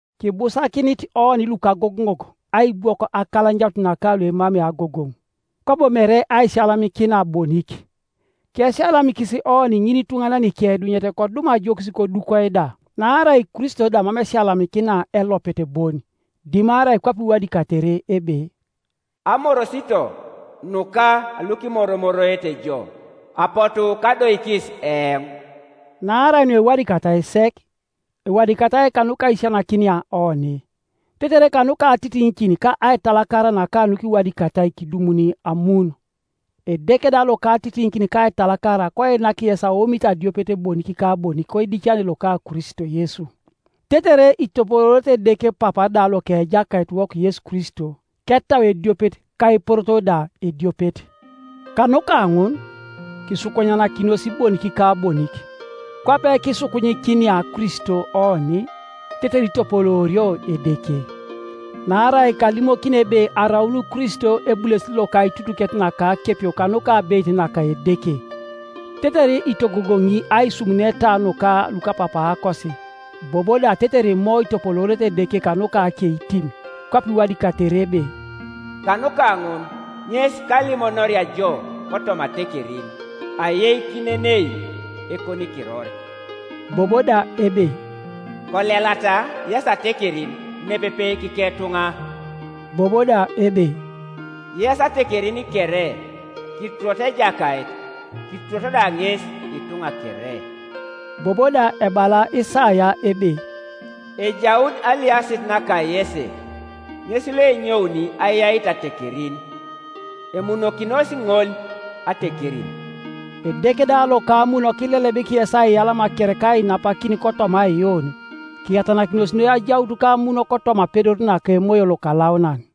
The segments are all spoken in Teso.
Kibusakinit oni lukagogoŋok aibwok akalanyanut naka luemamei agogoŋ, kwabo mere aisiyalamikina bonik. Kesiyalamikisi oni ŋinituŋanan ikeidunyet kodum ajokis kodukoi da. Naarai Kristo da mam esiyalamikina elopet bon; dimarai kwape iwadikatere ebe, “Amorosito nuka lukimoromoroete jo, apotu kadoikis eoŋ.” Naarai nuewadikatai sek, ewadikatai kanuka aisisianakinia oni, tetere kanuka atitiŋikin ka aitalakara naka nukiwadikatai kidumuni amun. Edeke da loka atitiŋikin ka aitalakara koinak yes aomit adiopet bonik ka bonik koidicane loka Kristo Yesu, tetere itopoloorete Edeke Papa da loka Ejakaitiwok Yesu Kristo, ketau ediopet ka eporoto da ediopet. Kanuka ŋun, kisukunyanakinos bonik ka bonik, kwape kiisukunyikinia Kristo oni, tetere itopoloorio Edeke. Naarai kalimokini ebe araun Kristo ebulesit loka aitutuket naka akepio kanuka abeit naka Edeke, tetere itogogoŋi aisumuneta nuka lukapapaakosi, bobo da tetere Imo itopoloorete Edeke kanuka akeitim, Kwape iwadikatere ebe, “Kanuka ŋun ŋes kalimonoria jo kotoma atekerin, Ayeikinenei ekonikiror.” Bobo da ebe, “Kolelata, yes atekerin, nepepe kiketuŋa.” Bobo da ebe, “Yes atekerin kere, kituroto Ejakait, Kituroto da ŋes Ituŋa kere.” Bobo da ebala Isaia ebe, “Ejaun aliasit naka Yese, Ŋes loenyouni ayait atekerin; Emunokinos ŋol atekerin.” Edeke da loka amun kilelebik yes aiyalama kere ka ainapakin kotoma aiyuun, kiyatanakinos noi ajaut kamun kotoma apedor naka Emoyo Lokalaunan.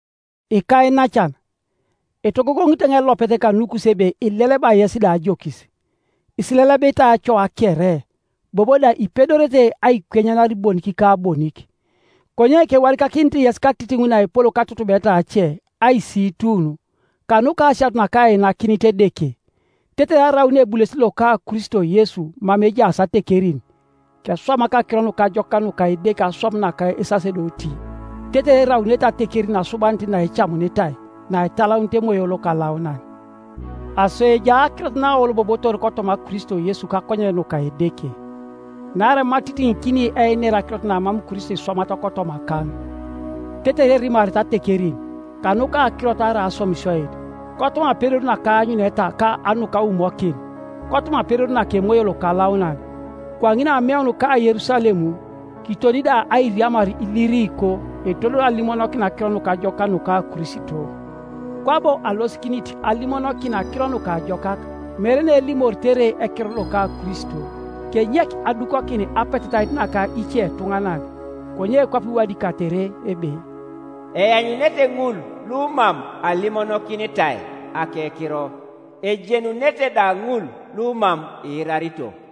Ikainacan, etogogoŋit eoŋ elopet kanukus ebe ileleba yes da ajokis, isilelebitai acoa kere, bobo da ipedorete aikwenyanar bonik ka bonik. Konye kewadikakinit yes katitiŋ naepol katutubeta ace, aisiitun, kanuka asianut nakainakinit Edeke, tetere araun ebulesit loka Kristo Yesu mama ejaas atekerin, keswamak Akiro Nukajokak nuka Edeke aswam naka esasedoti, tetere eraunete atekerin asubanit naecamunitai, naitalaunit Emoyo Lokalaunan, Aso ejai akirot naaolobobotor kotoma Kristo Yesu kakonyen nuka Edeke. Naarai mam atitiŋikini einer akirot namam Kristo iswamat kotomakaŋ, tetere erimarete atekerin, kanuka akirot arai aswamisioit, kotoma apedor naka aanyuneta ka nukaumokin, kotoma apedor naka Emoyo Lokalaunan, kwaŋin ameun ka Yerusalem, kiton da airiamar Iliriko etodol alimonokin Akiro Nukajokak nuka Kristo, kwabo alosikinit alimonokin Akiro Nukajokak, mere neelimoritere ekiror loka Kristo, kenyek adukokin apetetait naka icetuŋanan, konye kwape iwadikatere ebe, “Eanyunete ŋul lumam alimonokinitai akekiro, Ejenunete da ŋul lumam iirarito.”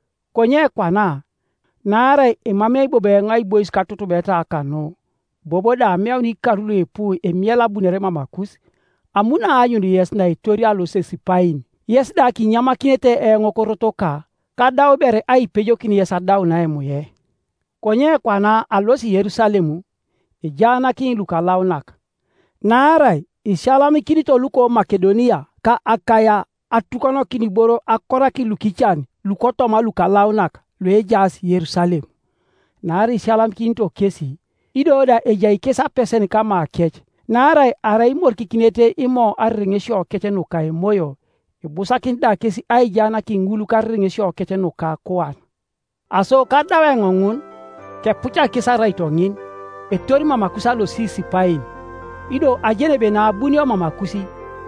konye kwana, naarai emamei bobo eoŋ aibois katutubeta kanu, bobo da ameun ikar luipu emiela abunore mamakus, amuno aanyun yes naetorio alosit Sipain, yes da kinyamakinete eoŋ korotoka, kadau ber aipejokin yes adaun aimue. Konye kwana alosi Yerusalem, ejaanakini lukalaunak. Naarai isiyalamikinito luko Makedonia ka Akaia atukonokin iboro akorakin lukican lukotoma lukalaunak luejaas Yerusalem. Naarai isiyalamikinito kesi, ido da ejai kes apesen kamakec, naarai arai imorikikinete Imo arereŋesiokec nuka emoyo, ibusakinit da kes aijaanakin ŋul karereŋesiokec nuka akuan. Aso kadau eoŋ ŋun, kepucak kes araito ŋin, etori mamakus alosit Sipain; ido ajeni ebe naabunio mamakus,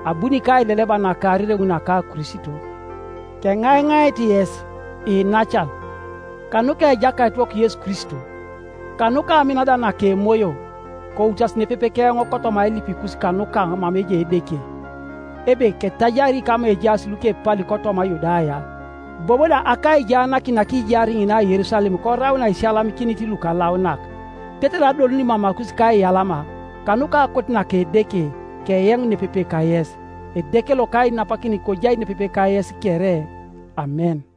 abuni kaileleba naka arereŋ naka Kristo. Keŋaiŋait yes, iinacan, kanuka Ejakaitiwok Yesu Kristo, kanuka amin da naka Emoyo, koutas nepepe keoŋ kotoma ailipikus kanukaŋ mama ejai Edeke, ebe ketajari kama ejaas lukepali kotoma Yudaya, bobo da akaijaanakin nakijaar ŋina Yerusalem korau naisiyalamikinit lukalaunak; tetere adoluni mamakus kaiyalama, kanuka akote naka Edeke, keyeŋ nepepe kayes. Edeke loka ainapakin kojai nepepe kayes kere. Amen.